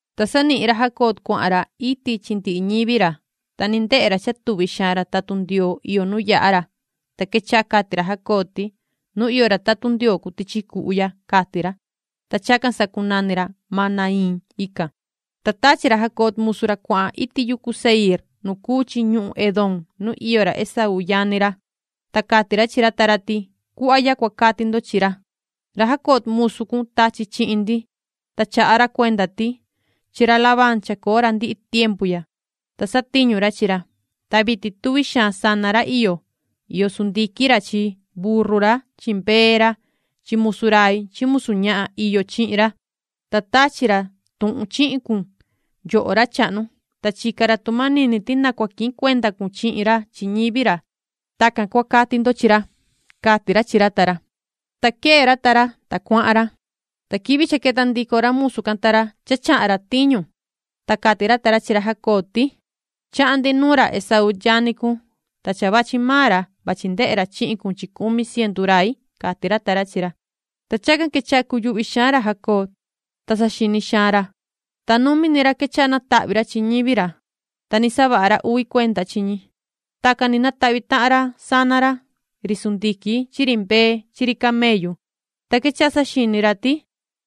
Ta sanihin ra Jacob cuahan ra iti chi ndihi ñivi ra. Ta ni ndehe ra cha tuvi xaan ra tatun Ndioo iyo nu yaha ra. Ta quechaha cati ra Jacob ti: ―¡Nu iyo ra tatun Ndioo cuu tichi cuhu ya! ―cati ra. Ta chacan sacunani ra Mahanaiim ican. Ta tachi ra Jacob musu ra cuahan iti yucu Seiir nu cuu chi ñuhun Edom nu iyo ra Esaú yani ra. Ta cati ra chi ra ta ra ti: “Cuhva ya cua cati ndo chi ra: ‘Ra Jacob musu cun tachi chihin ndi, ta chaha ra cuenda ti: Chi ra Labán chacoo ra ndihi tiempu ya, ta satiñu ra chi ra. Ta vitin tuvi xaan sana ra iyo. Iyo sundiquin ra chi burru ra chi mbee ra chi chivu ra chi musu rai chi musu ñahan iyo chihin ra, ta tachi ra tuhun chihin cun, yoho ra chahnu, ta chica ra tu manini ti na cua quihin cuenda cun chihin ra chi ñivi ra’. Tacan cua cati ndo chi ra”, cati ra chi ra ta ra. Ta quee ra ta ra, ta cuahan ra. Ta quivi cha queta ndico ra musu can ta ra cha chahan ra tiñu, ta cati ra ta ra chi ra Jacob ti: ―Chahan ndi nuun ra Esaú yani cun, ta cha vachi maan ra, vachi ndehe ra chihin cun chi cumi cientu rai ―cati ra ta ra chi ra. Ta chacan quechaha cuyuhvi xaan ra Jacob, ta saxini xaan ra, ta numi ni ra quechaha natahvi ra ñivi ra, ta ni savaha ra uvi cuenda chi ñi. Tacan ni natahvi tahan ra sana ra, ri sundiquin chi ri mbee chi ri chivu chi ri camellu. Ta quechaha saxini ra ti: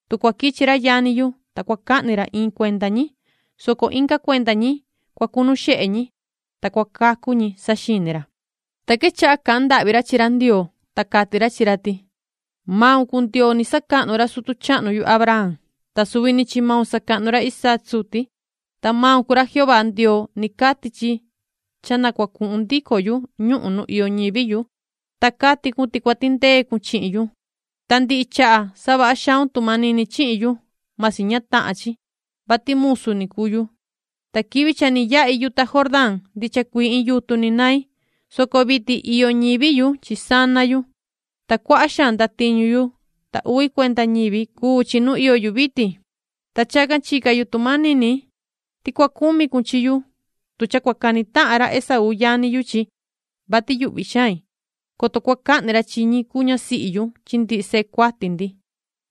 “Tu cua quichi ra yani yu, ta cua cahni ra iin cuenda ñi, soco inga cuenda ñi, cua cunu xehe ñi, ta cua cacu ñi”, saxini ra. Ta quechaha cahan ndahvi ra chi ra Ndioo, ta cati ra chi ra ti: “Maun cuu Ndioo ni sacahnu ra sutu chahnu yu Abraham, ta suvi ni chi maun sacahnu ra Isaac suti, ta maun cuu ra Jehová Ndioo ni cati chi cha na cua cuhun ndico yu ñuhun nu iyo ñivi yu, ta cati cun ti cua tindee cun chihin yu. Ta ndihi chaha savaha xaun tu manini chihin yu, masi ña tahan chi, vati main cuu musu cun. Ta quivi cha ni yahi yuta Jordán ndicha cuii iin yutun ni nain, soco vitin iyo ñivi yu chi sana yu, ta cuaha xaan ndatiñu yu, ta uvi cuenda ñivi cuu chi nu iyo yu vitin. Ta chacan chica yu tu manini ti cua cumi cun chihin yu tu cha cua cani tahan ra Esaú yani yu chi, vati yuhvi xain, coto cua cahni ra chi ñi cuu ñasihi yu chi ndihi sehe cuati ndi,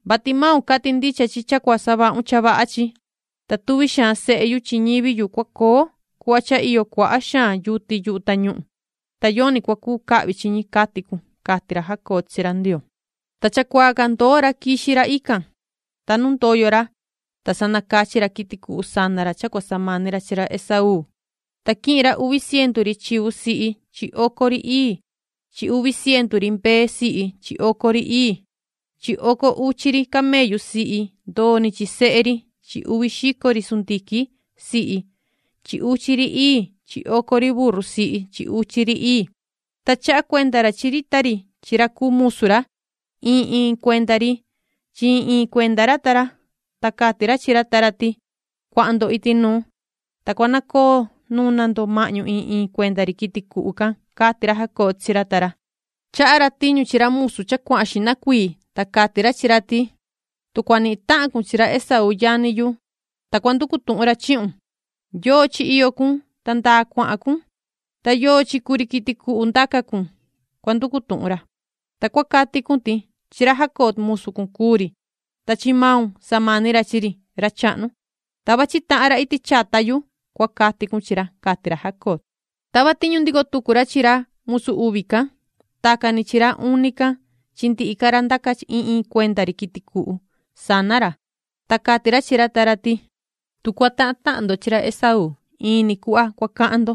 vati maun cati ndicha chi cha cua savahun cha vaha chi, ta tuvi xaan sehe yu chi ñivi yu cua coo cuhva cha iyo cuaha xaan yuti yuhu tañuhun, ta yoni cua cuu cahvi chi ñi, cati cun”, cati ra Jacob chi ra Ndioo. Ta chacuaa can ndoo ra quixi ra ican, ta nu ndoyo ra, ta sa nacachi ra quiti cuhu cha cua samani ra chi ra Esaú. Ta quihin ra uvi cientu ri chivu sihi chi oco ri ii chi uvi cientu ri mbee sihi chi oco ri ii chi oco uchi ri camellu sihi ndoo ni chi sehe ri chi uvi xico ri sundiquin sihi chi uchi ri ii chi oco ri burru sihi chi uchi ri ii. Ta chaha cuenda ra chi ri ta ri chi ra cuu musu ra, iin iin cuenda ri chi iin iin cuenda ra ta ra, ta cati ra chi ra ta ra ti: ―Cuahan ndo iti nuu, ta cua nacoo nuna ndo mahñu iin iin cuenda ri quiti cuhu can ―cati ra Jacob chi ra ta ra. Chaha ra tiñu chi ra musu cha cuahan xihna cuii, ta cati ra chi ra ti: ―Tu cua nihin tahan cun chi ra Esaú yani yu, ta cua nducu tuhun ra chihun ‘¿Yoo chi iyo cun, ta ndaa cuahan cun, ta yoo chi cuu ri quiti cuhu ndaca cun?’, cua nducu tuhun ra. Ta cua cati cun ti: ‘Chi ra Jacob musu cun cuu ri, ta chi maun samani ra chi ri, ra chahnu, ta vachi tahan ra iti chata yu’, cua cati cun chi ra ―cati ra Jacob. Tava tiñu ndico tucu ra chi ra musu uvi can, tacan ni chi ra uni can chi ndihi ca ra ndaca iin iin cuenda ri quiti cuhu sana ra. Ta cati ra chi ra ta ra ti: ―Tu cua tahan tahan ndo chi ra Esaú, in ni cuhva cua cahan ndo,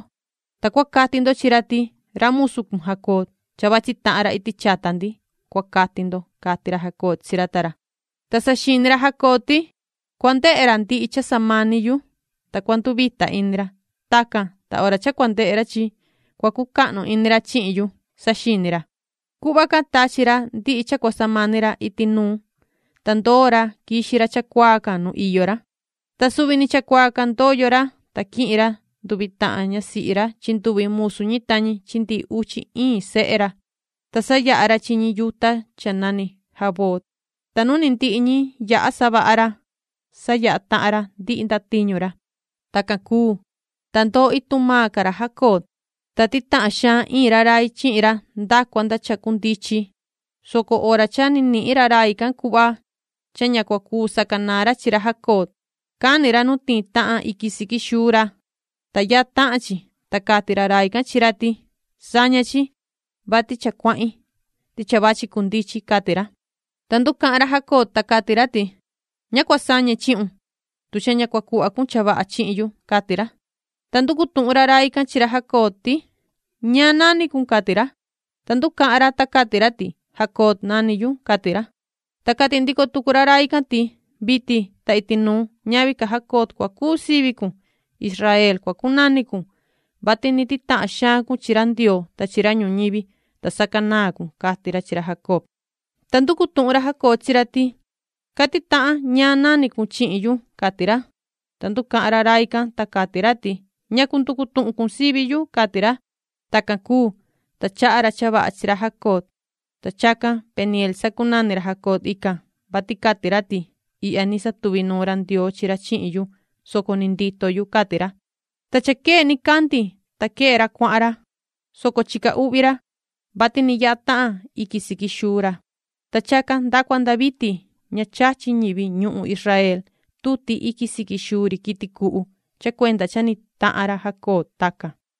ta cua cati ndo chi ra ti: ‘Ra musu cun Jacob, cha vachi tahan ra iti chata ndi’ cua cati ndo ―cati ra Jacob chi ra ta ra. Ta saxini ra Jacob ti: “Cua ndehe ra ndihi cha samani yu, ta cua nduvita ini ra. Tacan, ta hora cha cua ndehe ra chi cua cucahnu ini ra chihin yu”, saxini ra. Cuhva can tachi ra ndihi cha cua samani ra iti nuun, ta chacuaa can quixi ra nu ndoo nuun ra. Ta suvi ni chacuaa can ndoyo ra, ta quihin ra nduvi tahan ñasihi ra chi nduvi musu ñi ta ñi chi ndihi uchi iin sehe ra, ta sayaha ra chi ñi yuta cha nani Jaboc. Ta nu ni ndihi ñi yaha savaha ra, sayaha tahan ra ndihi ndatiñu ra. Tacan cuu, ta ndoo ituhun maan ca ra Jacob, ta titahan xaan iin ra rai chihin ra nda cua nda cha cundichin, soco hora cha nihin ra rai can cuhva cha ña cua cuu sacanaan ra chi ra Jacob, cani ra nu tiin tahan iquin siqui xuu ra, ta yaha tahan chi. Ta cati ra rai can chi ra ti: ―Saña chi, vati cha cuahin, ti cha vachi cundichin ―cati ra. Ta nducahan ra Jacob, ta cati ra ti: ―Ña cua sañe chihun, tu cha ña cua cuhva cun cha vaha chihin yu ―cati ra. Ta nducu tuhun ra rai can chi ra Jacob ti: ―¿Ñaan nani cun? ―cati ra. Ta nducahan ra, ta cati ra ti: ―Jacob nani yu ―cati ra. Ta cati ndico tucu ra rai can ti: ―Vitin ta iti nuun ñavi ca Jacob cua cuu sivi cun. Israel cua cunani cun, vati ni titahan xaan cun chi ra Ndioo ta chi ra ñuñivi, ta sacanaan cun ―cati ra chi ra Jacob. Ta nducu tuhun ra Jacob chi ra ti: ―Cati tahan ñaan nani cun chihin yu ―cati ra. Ta nducahan ra rai can, ta cati ra ti: ―¿Ñacu nducu tuhun cun sivi yu? ―cati ra. Tacan cuu, ta chaha ra cha vaha chi ra Jacob. Ta chacan Penieel sacunani ra Jacob ican, vati cati ra ti: “Ihya ni satuvi nuun ra Ndioo chi ra chihin yu, soco ni ndito yu”, cati ra. Ta cha quee nicandi, ta quee ra cuahan ra, soco chica uhvi ra, vati ni yaha tahan iquin siqui xuu ra. Ta chacan nda cua nda vitin ña chachi ñivi ñuhun Israel tuti iquin siqui xuu ri quiti cuhu cha cuenda cha ni tahan ra Jacob tacan.